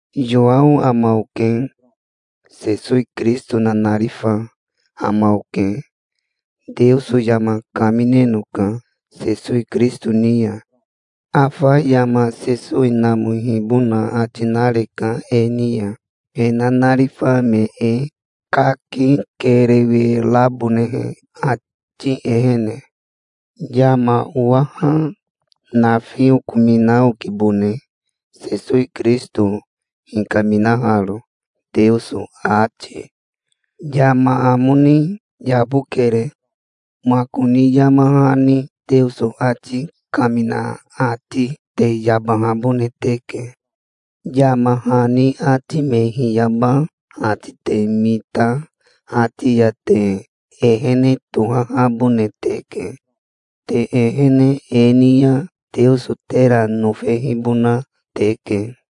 Yowao ama oke. Sesowi Kirisito nanarifa ama oke. Teoso yama kaminenoka Sesowi Kirisito ni ya. Afa yama Sesowi namohibona ati nareka e ni ya, he nanarifa me e, kaki kerewe rabonehe, ati ehene. Yama owaha nafi okomina okibone Sesowi Kirisito hikaminaharo, Teoso ati. Yama amo ni yabokere. Makoni yama hani Teoso ati kamina ati te yabahabone teke. Yama hani ati me hiyaba ati te mita ati ya te ehene tohahabone teke. Te ehene e ni ya Teoso tera nofehibona teke.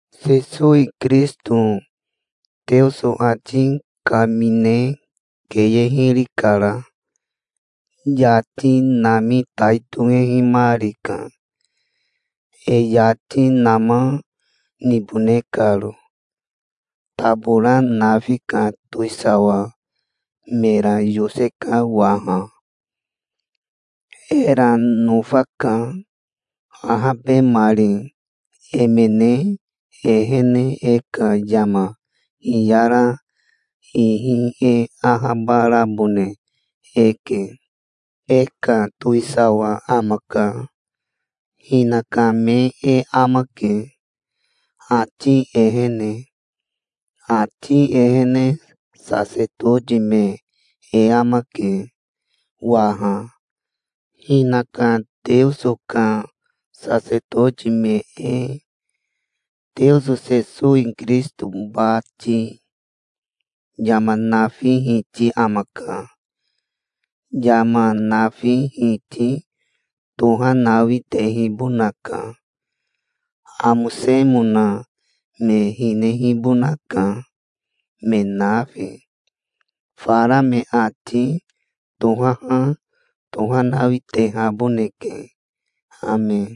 Sesowi Kirisito Teoso ati kamine keye hiri kara. Yati nami tai tohehimarika, e yati nama nibone karo. Tabora nafi ka towisawa mera yoseka waha. Era nofaka. Ahabemari emene ehene e ka yama hiyara ihi e ahabarabone eke. E ka towisawa amaka. Hinaka me e amake, ati ehene. Ati ehene sasetoti me e amake waha, hinaka Teoso ka sasetoti me e, Teoso Sesowi Kirisito bati. Yama nafi Hiti amaka. Yama nafi Hiti tohanawi tehibonaka. Amosemona me hinehibonaka, me nafi. Fara me ati tohaha tohanawi tehaboneke. Ame.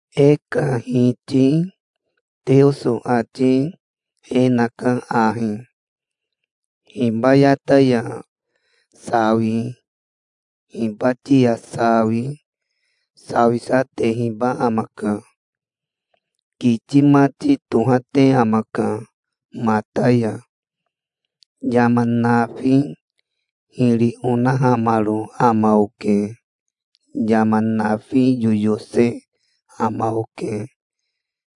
E ka Hiti Teoso ati e naka ahi. Hibayata ya sawi, hibati ya sawi, sawisa, tehiba amaka. Kiti mati tohate amaka mata ya. "Yama nafi hiri onahamaro ama oke. Yama nafi yoyose ama oke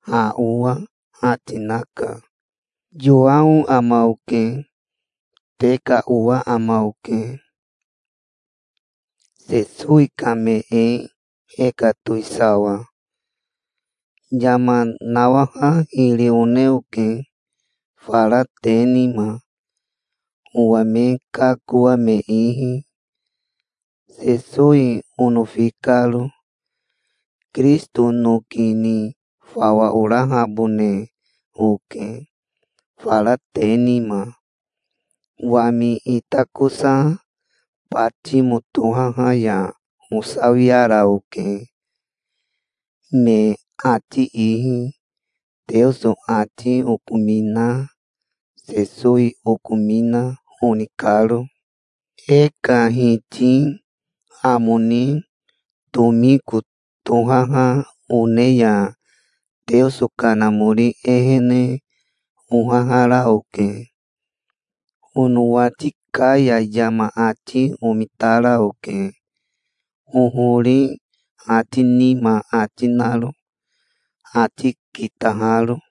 ha owa", ati naka. Yowao ama oke. Te ka owa ama oke, Sesowi ka me e, e ka towisawa. Yama nawaha hiri one oke fara te nima, owa me kakoa me ihi, Sesowi onofi karo. Kirisito noki ni fawa orahabone oke fara te nima. Wami itakosa Batimo tohaha ya osawiara oke me ati ihi, Teoso ati okomina, Sesowi okomina, oni karo. E ka Hiti amo ni tomiko tohaha one ya Teoso Kanamori ehene ohahara oke. Onowati ka ya yama ati omitara oke, hohori ati nima ati naro, ati kitaharo.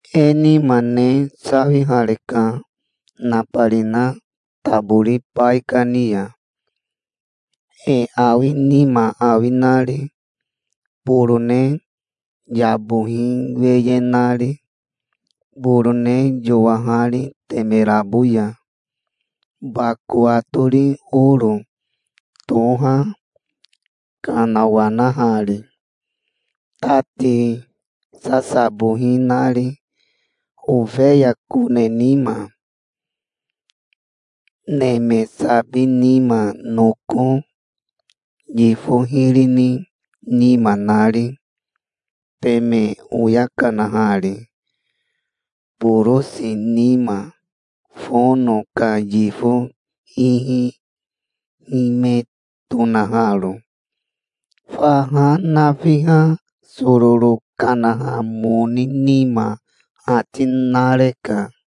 E nima ne sawihareka nabarina tabori baikani ya, e awi nima awi nari, borone yabohi weye nari, borone yowahari temerabo ya, bako atori oro toha kanawanahari, tati sasabohi nari, ofeya kone nima, neme sabi nima, noko yifo hiri ni nima nari, teme oya kanahari borosi nima, fono ka yifo ihi hime tonaharo. Faha nafiha sororo kanaha moni nima ati nareka.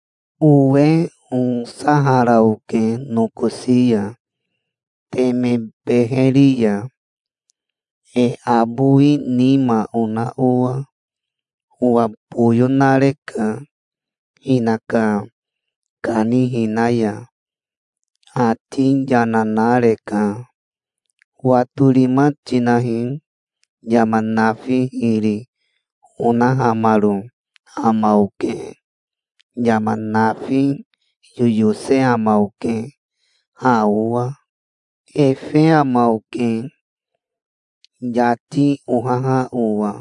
Owe osahara oke nokosi ya, teme beheri ya, e abowi nima ona owa. Owa boyo nareka hinaka kanihina ya. Ati yana nareka. "Watorima tinahi. Yama nafi hiri onahamaro ama oke. Yama nafi yoyose ama oke ha owa. Efe ama oke, yati ohaha owa,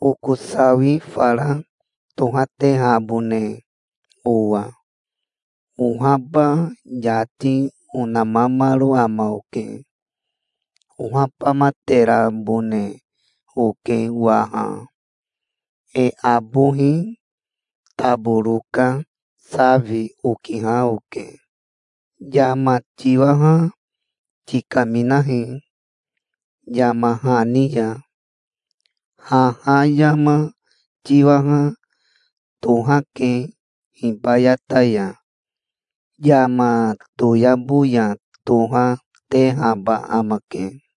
oko sawi fara tohatehabone owa. Ohaba yati onamamaro ama oke. Ohabamaterabone oke waha. E abohi taboro ka safi okiha oke. Yama tiwaha tikaminahi yama hani ya. Haha yama tiwaha tohake hibayata ya. Yama toyabo ya toha, tehaba amake.